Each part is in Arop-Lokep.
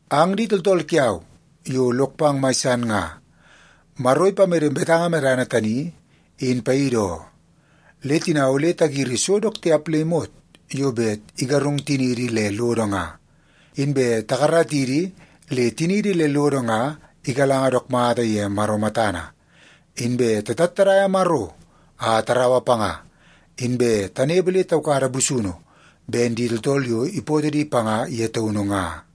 Ang di tooltool kiau yo lok pang mai san nga, Maro ipamede betanga medana tani in paidi oo. Le tina ole tagiri so dook tiap le imot yo bet igarung tiniidi le lodo nga, inbe takaratidi le tiniidi le lodo nga igalanga dook mata ye Maro matana. Inbe tatattadaia Maro a taraua panga, inbe tanepe le taukada busunu ben di tooltool yo ipootoo di panga ye taunu nga.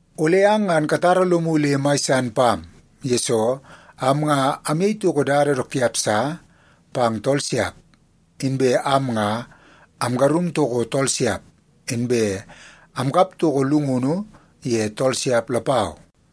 Ole ang ngan katara lomu le mai san pam, yesoo am nga amyei toko dada dook tiap sa pang tool siap. Inbe am nga amgarung toko tool siap, inbe amkap toko llungunu ye tool siap lapau.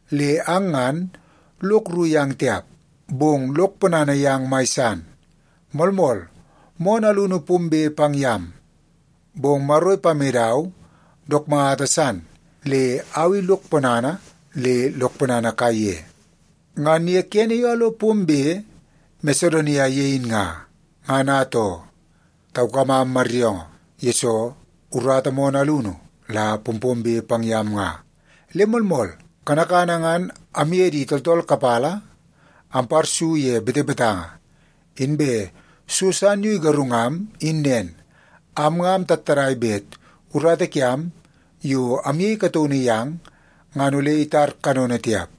Le ang ngan, lok rru yang tiap, bong lok ponana yang mai san. Moolmool, moonoo alunu pombe pang yam, bong Maro ipamedau dook mata san le au i lok ponana le lok ponana kaiye. Ngan ye kene yo amlo pombe Masedonia ye in nga, ngan atoo, taukamam maryoongoo, yesoo urata moonoo alunu la pompombe pang yam nga. Le moolmool, kanakana ngan amye di tooltool kapala amparsu ye betebetanga, inbe so san yo igarungam in nen, am nga amtattadai bet urata kiam yo amyei kataunu yang, ngan ole itar kanono tiap.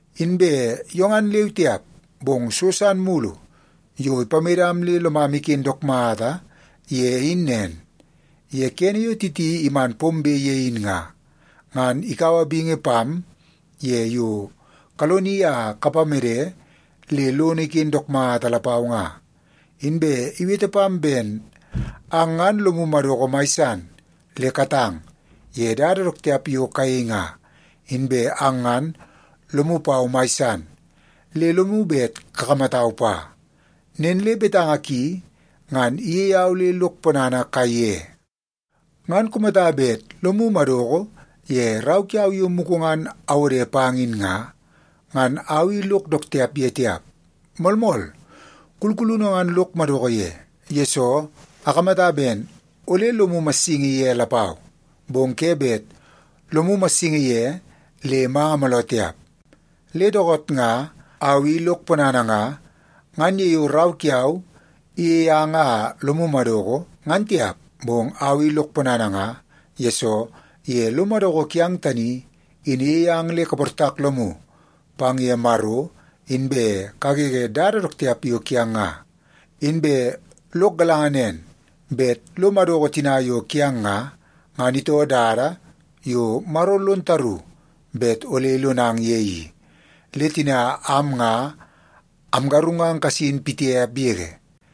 Inbe yo ngan leu tiap, bong so san mulu yo ipamedam le lomam iken dook mata ye in nen, ye kene yo Titi iman pombe ye in nga, ngan ikaua bingi pam ye yo kaloni a kapamede le lono iken dook mata lapau nga. Inbe iwete pam ben ang ngan lomu madoko mai san le katang ye dada dook tiap yo kayei nga, inbe ang ngan lomu pau mai san, le lomu bet kakamatau pa. Nen le betanga ki, ngan iyei au le lok ponana kaiye. Ngan kumata bet lomu madoko ye rau kiau yo mugu ngan awode pang in nga, ngan au i lok dook tiap ye tiap. Moolmool, kulkulunu ngan lok madoko ye, yesoo akamata ben ole lomu massingi ye lapau, bong ke bet lomu massingi ye le manga mooloo tiap. Le dookoot nga au i lok ponana nga, ngan ye yo rau kiau iyei ang a lomu madoko, ngan tiap. Bong au i lok ponana nga, yesoo ye lo madoko kiang tani i, in iyei ang le kaportak lomu pang ye Maro inbe kagege dada dook tiap yo kiang nga. Inbe lok galanga nen bet lo madoko tina yo kiang nga, ngan itoo dada yo Maro lon taru bet ole ilonang ye i. Le tina am nga amgarungang kasin pitiap yege.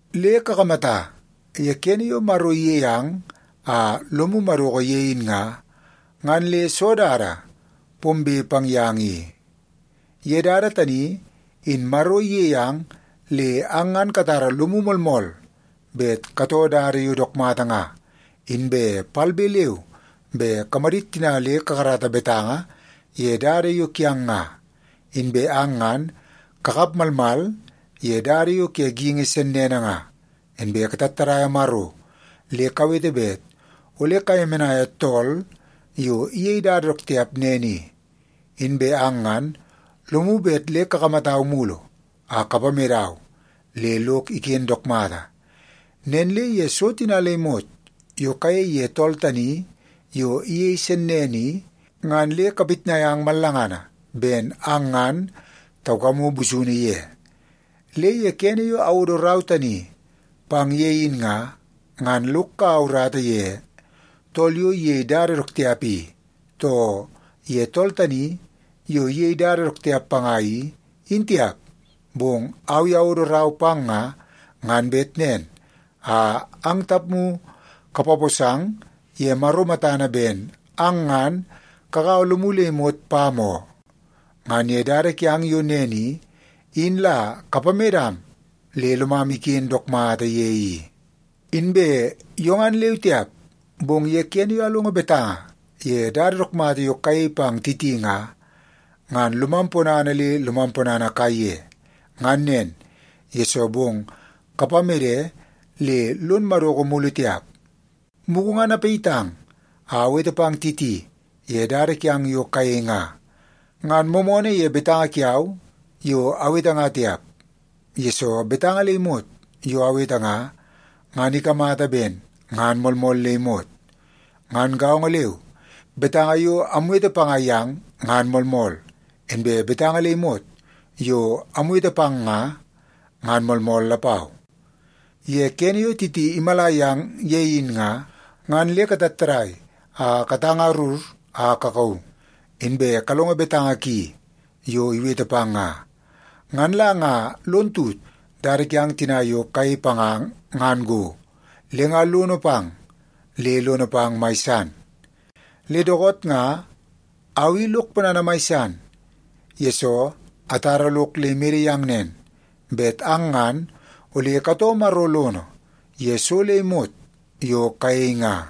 Le kakamata, ye kene yo Maro iyei ang a lomu madoko ye in nga, ngan le soo dada pombe pang yang i? Ye dada tani, in Maro iyei ang le ang ngan katara lomu moolmool bet katoo dada yo dook mata nga, inbe palbe leu be kamadit tina le kakarata betanga ye dada yo kiang nga. Inbe ang ngan kakap malmal ye dada yo ke geingi sennene nga, inbe katattadaia Maro le kawete bet ole kayemenaia tool yo iyei dada dook tiap nen i. Inbe ang ngan lomu bet le kakamatau mulu a kapamedau le lok iken dook mata. Nen le ye so tina le imot yo kayei ye tool tani yo iyei sennene i, ngan le kapitnai ang mallangana ben ang ngan taukamu busunu ye. Le ye kene yo awodo rau tani pang ye in nga, ngan lok kaua urata ye tool yo iyei dada dook tiap i, too ye tool tani yo iyei dada dook tiap panga i, in tiap. Bong au i awodo rau pang nga, ngan bet nen a ang tapmu kapaposang ye Maro matana ben ang ngan kagaua lomu le imot pam oo. Ngan ye dada kiang yo nen i, in la kapamedam le lomam iken dook mata ye i. Inbe yo ngan leu tiap, bong ye kene yo amlongo betanga ye dada dook mata yo kayei pang Titi nga, ngan lomam ponana le lomam ponana kaiye. Ngan nen, yesoo bong kapamede le lon madoko mulu tiap. Mugu ngan apayitang a awete pang Titi ye dada kiang yo kayei nga. Ngan moomoonoo ye betanga kiau yo awete nga tiap, yesoo betanga le imot yo awete nga, ngan ikamata ben ngan moolmool le imot. Ngan gaongo leu, betanga yo amwete panga yang ngan moolmool, inbe betanga le imot yo amwete pang nga, ngan moolmool lapau. Ye kene yo Titi imala yang ye in nga, ngan le katattadai a katangarur a kakauu, inbe kalongo betanga ki yo iwete pang nga. Ngan la nga lon tut dada kiang tina yo kayei panga ngan go, le nga lono pang le lono pang mai san. Le dookoot nga au i lok ponana mai san, yesoo atara lok le imede yang nen, bet ang ngan ole katoo Maro lono ye so le imot yo kayei nga.